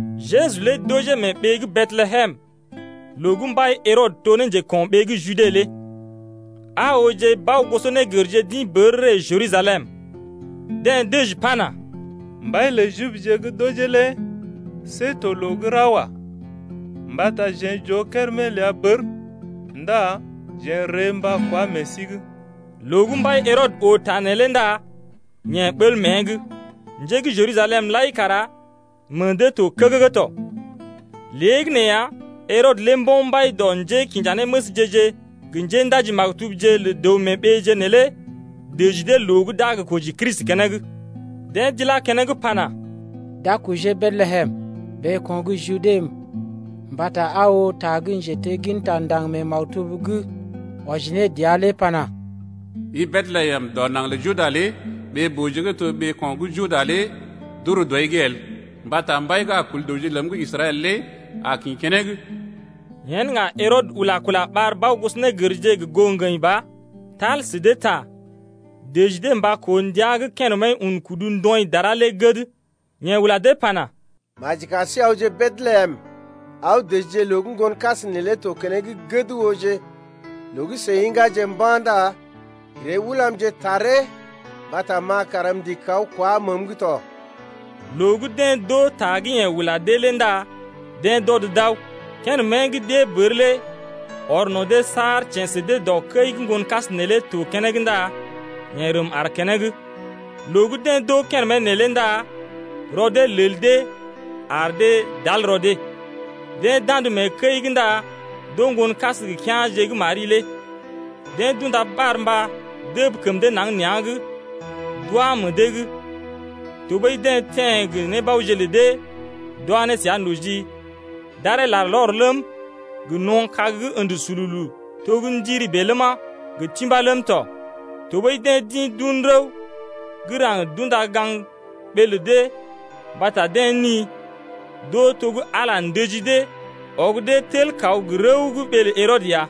Jeju lé d’ojee mee ɓee gə́ Betlehem loo gə́ mbai Herɔdə to ne njeko̰ɓee gə́ Jude lé. Aa ooje bao-gosɔnégərje d’ḭ bər ree Jerusalem. Deḛ dəji pana: Mbai lə Jibje gə́ d’ojee lé see to loo gə́ ra wa. Mbata jeḛ j’oo kérèmé ləa bər ndá jeḛ n’ree mba kwá meḛ sí’g. Loo gə́ mbai Herɔdə oo ta neelé ndá yeḛ ɓəl mée’g, njé gə́ Jerusalem lai kara meḛ dee to kəgəgə tɔ. Léegəneeya, Herɔdə lé mbo̰ mbai dɔ njékinjanéməsje-je gə njéndaji-maktubje lə dəw-mee-ɓeeje neelé dəji dee loo gə́ d’a gə koji Kristi keneŋ. Deḛ d’ilá keneŋ pana: D’a kojee Betlehem ɓeeko̰ gə́ Jude mbata aa oo ta gə́ njetegginta ndaŋg mee maktub’g, wɔji ne dəa lé pana: I Betlehem dɔ naŋg lə Juda lé Ɓee-booje gə́ to ɓeeko̰ gə́ Juda lé d’ur dɔi’g el, Mbata mbai gə́ a kul dəwje ləm gə Israɛl lé a kḭ keneŋ. Yen ŋga Herɔdə ula kula ɓar bao-gosɔnégərje gə goo ŋgəḭ ba, tal sə dee ta, dəji dee mba koo ndəa gə́ kérèmé lé un kudu ndɔḭ dara lé gəd. Yeḛ ula dee pana: Maji kar sí awje Betlehem, aw dəjije loo gə́ ŋgonkas neelé to keneŋ gəd ooje. Loo gə́ seḭ ḭgáje mba̰ ndá ree ulamje taree mbata ma kara m’ndigi kaw kwá məəm’g tɔ. Loo gə́ deḛ d’oo ta gə́ yeḛ ula dee lé ndá deḛ d’ɔd d’aw. Kérémé gə́ d’ée bər lé ɔr no̰ dee saar teḛ sə dee dɔ kəi gə́ ŋgonkas neelé to keneŋ ndá yeḛ rəm aar keneŋ. Loo gə́ deḛ d’oo kérèmé neelé ndá rɔ dee lel dee ar dee d’al rɔ dee. Deḛ d’andə mee kəi’g ndá d’oo ŋgonkas gə kea̰je gə́ Mari lé. Deḛ d’unda barmba dəb kəm dee naŋg nea̰’g. Tɔɓəi deḛ teḛ gə nébaoje lə dee d’wa ne səa noji, d’aree larlɔr ləm, gə no̰ kag gə́ ə̰də sululu ləma, gə timbá ləm tɔ. Tɔɓəi deḛ d’ḭ d’un rəw gə́ raŋg d’unda gaŋg ɓee lə dee mbata deḛ ni, d’oo to gə́ Ala ndəji dee, ɔg dee tel kaw gə rəw gə́ ɓee lə Herɔdə ya.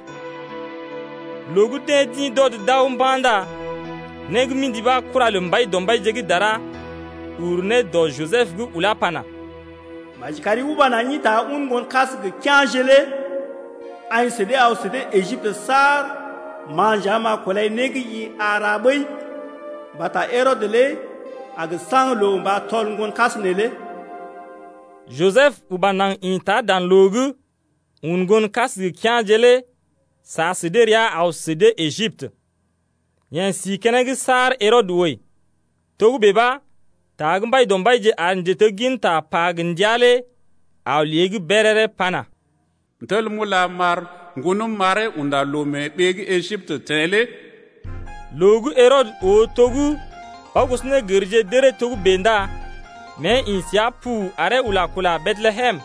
Loo gə́ deḛ d’ḭ d’ɔd d’aw mba̰ ndá né gə́ mḭdi ɓa kura lə Mbaidɔmbaije gə́ dara ur ne dɔ Jisəb’g ulá ne pana: Maji kari uba naŋg ḭta un ŋgonkas gə kea̰je lé aḭ sə dee aw sə dee Ejiptə saar ma nja m’a kulai né gə́ i a ra ɓəi. Mbata Herɔdə lé a gə saŋg loo mba tɔl ŋgonkas neelé ya. Jisəb uba naŋg ḭta dan loo’g, un ŋgonkas gə kea̰je lé sa sə dee rəa aw sə dee Ejiptə. Yeḛ si keneŋ saar Herɔdə wəi tɔ. Togə́bè ɓa ta gə́ Mbaidɔmbaije ar njetegginta pa gə ndia lé aw ne lée’g béréré pana: M’tel m’ula m’ɓar ŋgonəm m’aree unda loo mee gə́ Ejiptə teḛ lé. Loo gə́ Herɔdə oo to gə́ bao-gosɔnégərje d’əree togə́bè ndá mée ḭ səa pu aree ula kula Betlehem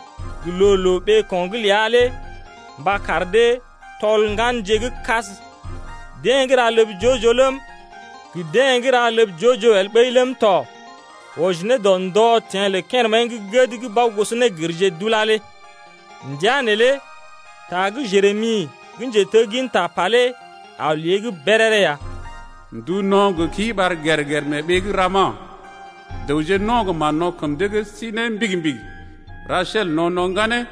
gə loo-loo ɓeeko̰’g ləa mba kar dee tɔl ŋganje gə́ kas, deḛ gə́ ra ləb joo-joo ləm, gə deḛ gə́ ra ləb joo-joo el ɓəi ləm tɔ wɔji ne dɔ ndɔ teḛ lə kérèmé gə́ gəd gə́ bao-gosɔnégərje d’ulá lé tɔ. Ndəa neelé ta gə́ Jeremi gə́ njetegginta pa lé aw lée’g béréré ya. Ndu no̰ gə kii ɓar gèr-gèr mee ɓee gə́ Rama, Dəwje no̰ gə mán-no̰ kəm dee’g d’isi ne ndan ndòo-yoo’g. Rasel no̰ no̰ ŋganeeje,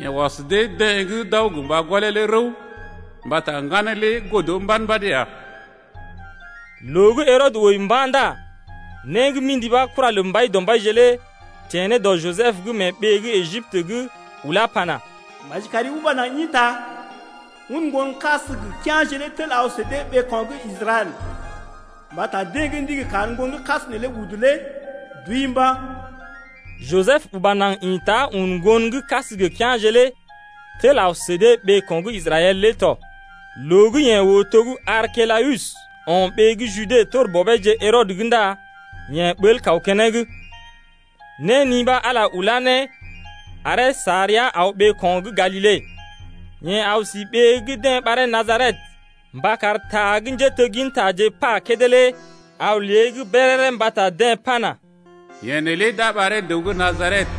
Yeḛ ɔs dee-deḛ gə́ d’aw gə mba gɔlee lé rəw Mbata ŋganeeje lé godo mbad-mbad ya. Loo gə́ Herɔdə wəi mba̰ ndá né gə́ mḭdi ɓa kura lə Mbaidɔmbaije lé teḛ ne dɔ Jisəb’g mee ɓee gə́ Ejiptə’g ulá ne pana: Maji kari uba naŋg ḭta, un ŋgonkas gə kea̰je lé tel aw sə dee ɓeeko̰ gə́ Israɛl, mbata deḛ gə́ ndigi kar ŋgonkas neelé udu lé d’wəi mba̰ ya. Jisəb uba naŋg ḭta un ŋgonkas gə kea̰je lé tel aw sə dee ɓeeko̰ gə́ Israɛl lé tɔ. Loo gə́ yeḛ oo to gə́ Arkelawus o̰ ɓee gə́ Jude tor bɔbeeje Herɔdə’g ndá yeḛ ɓəl kaw keneŋ. Néni ɓa Ala ulá ne aree sa rəa aw ɓeeko̰ gə́ Galile. Yeḛ aw si ɓee gə́ deḛ ɓaree Najaret mba kar ta gə njéteggintaje pa kédé lé aw ne lée’g béréré mbata deḛ pana: Yeḛ neelé d’a ɓaree dəw gə́ Najaret.